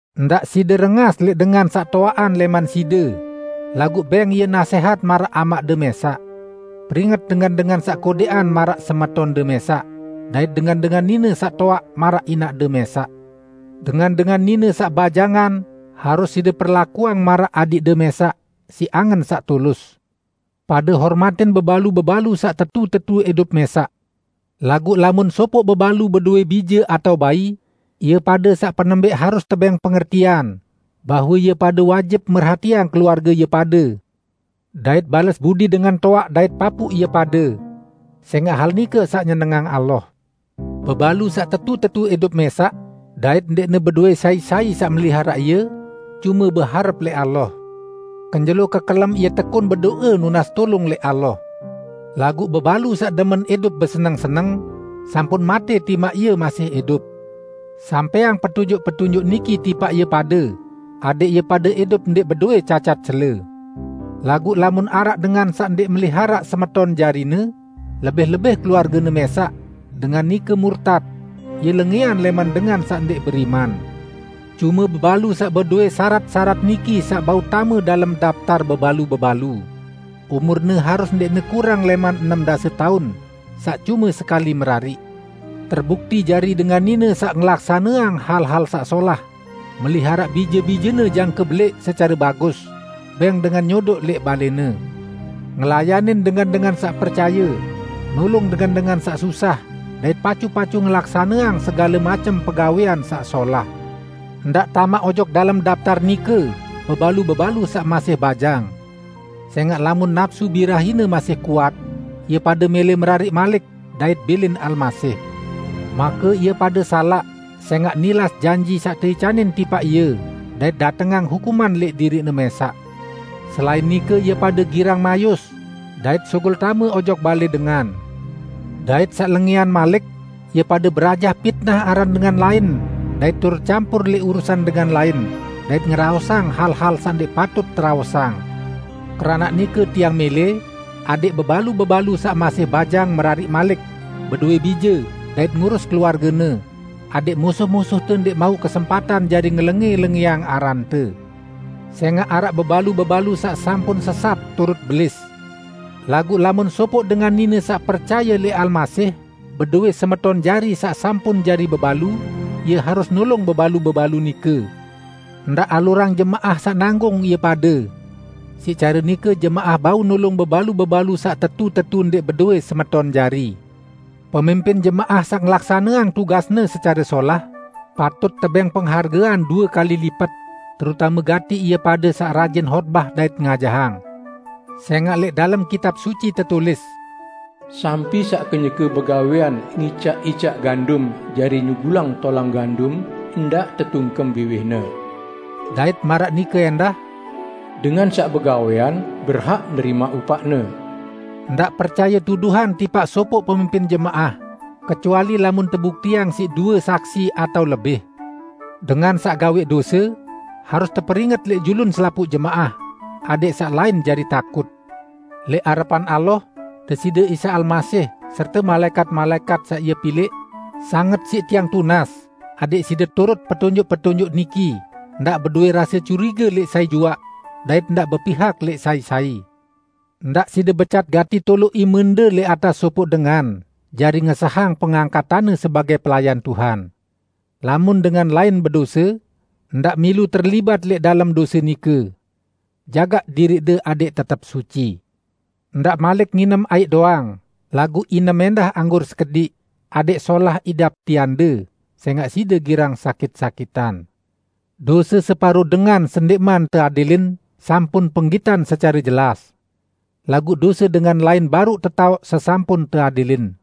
Ndaq side rengas lẽq dengan saq toaqan lẽman side, laguq bẽng ie nasẽhat maraq amaqde mẽsaq. Peringet dengan-dengan saq kodẽqan maraq semetonde mẽsaq, dait dengan-dengan nine saq toaq maraq inaqde mẽsaq. Dengan-dengan nine saq bajangan harus side perlakuang maraq adiqde mẽsaq, siq angen saq tulus. Pade hormatin bebalu-bebalu saq tetu-tetu idup mẽsaq. Laguq lamun sopoq bebalu bedowẽ bije atao bai, ie pade saq penembẽq harus tebẽng pengertian bahwe ie pade wajib merhatiang keluarge ie pade, dait bales budi dengan toaq dait papuq ie pade. Sẽngaq hal nike saq nyenengang Allah. Bebalu saq tetu-tetu idup mẽsaq, dait ndẽqne bedowẽ sai-sai saq meliharaq ie, cume beharep lẽq Allah. Kenjelo kekelem ie tekun bedo'e nunas tulung lẽq Allah. Laguq bebalu saq demen idup beseneng-seneng, sampun matẽ timaq ie masih idup. Sampẽang petunjuk-petunjuk niki tipaq ie pade, adẽq ie pade idup ndẽq bedowẽ cacat cele. Laguq lamun araq dengan saq ndẽq meliharaq semeton jarine, lebih-lebih keluargene mẽsaq, dengan nike murtat; ie lengẽan lẽman dengan saq ndẽq beriman. Cume bebalu saq bedowẽ syarat-syarat niki saq bau tame dalem daptar bebalu-bebalu: Umurne harus ndẽqne kurang lẽman enem dase taun, saq cume sekali merariq, terbukti jari dengan nine saq ngelaksaneang hal-hal saq solah, meliharaq bije-bijene jangke belẽq secare bagus, bẽng dengan nyodoq lẽq balẽne, ngelayanin dengan-dengan saq percaye, nulung dengan-dengan saq susah, dait pacu-pacu ngelaksaneang segale macem pegawẽan saq solah. Ndaq tamaq ojok dalem daptar nike bebalu-bebalu saq masih bajang. Sẽngaq lamun napsu birahine masih kuat, ie pade mẽlẽ merariq malik, dait bilin Almasih. Make ie pade salaq sẽngaq nilas janji saq teicanin tipaq ie dait datengang hukuman lẽq diriqne mẽsaq. Selain nike ie pade girang mayus dait sugul tame ojok balẽ dengan. Dait saq lengẽan malik, ie pade berajah pitnah aran dengan lain dait turut campur lẽq urusan dengan lain, dait ngeraosang hal-hal saq ndẽq patut teraosang. Keranaq nike tiang mẽlẽ adẽq bebalu-bebalu saq masih bajang merariq malik, bedowẽ bije, dait ngurus keluargene, adẽq musuh-musuhte ndẽq mauq kesempatan jari ngelengẽ-lengẽang arante. Sẽngaq araq bebalu-bebalu saq sampun sesat turut Belis. Laguq lamun sopoq dengan nine saq percaye lẽq Almasih bedowẽ semeton jari saq sampun jari bebalu, ie harus nulung bebalu-bebalu nike; ndaq alurang jemaah saq nanggung ie pade. Siq care nike jemaah bau nulung bebalu-bebalu saq tetu-tetu ndẽq bedowẽ semeton jari. Pemimpin jemaah saq ngelaksaneang tugasne secare solah, patut tebẽng penghargean due kali lipet, terutame gati ie pade saq rajin hotbah dait ngajahang. Sẽngaq lẽq dalem Kitab Suci tetulis, "Sampi saq kenyeke begawẽan ngicaq-icaq gandum jari nyugulang tolang gandum ndaq tetungkem biwihne", dait maraq nike ẽndah, "Dengan saq begawẽan berhak nerimaq upaqne". Ndaq percaye tuduhan tipaq sopoq pemimpin jemaah, kecuali lamun tebuktiang siq due saksi atao lebih. Dengan saq gawẽq dose, harus teperinget lẽq julun selapuq jemaah, adẽq saq lain jari takut. Lẽq arepan Allah, Deside Isa Almasih, serte malaẽkat-malaẽkat saq Ie pilẽq, sanget siq tiang tunas adẽq side turut petunjuk-petunjuk niki ndaq bedowẽ rase curige lẽq sai juaq, dait ndaq bepihak lẽq sai-sai. Ndaq side becat gati toloq imende lẽq atas sopoq dengan jari ngesahang pengangkatanne sebagẽ pelayan Tuhan. Lamun dengan lain bedose, ndaq milu terlibat lẽq dalem dose nike. Jagaq diriqde adẽq tetep suci. Ndaq malik nginem aiq doang; laguq inem ẽndah anggur sekediq adẽq solah idap tiande, sẽngaq side girang sakit-sakitan. Dose separo dengan sendẽqman teadilin sampun penggitan secare jelas. Laguq dose dengan lain baruq tetaoq sesampun teadilin.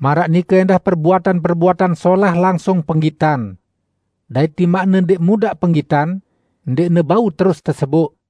Maraq nike ẽndah perbuatan-perbuatan solah langsung penggitan. Dait timaqne ndẽq mudaq penggitan, ndẽqne bau terus teseboq.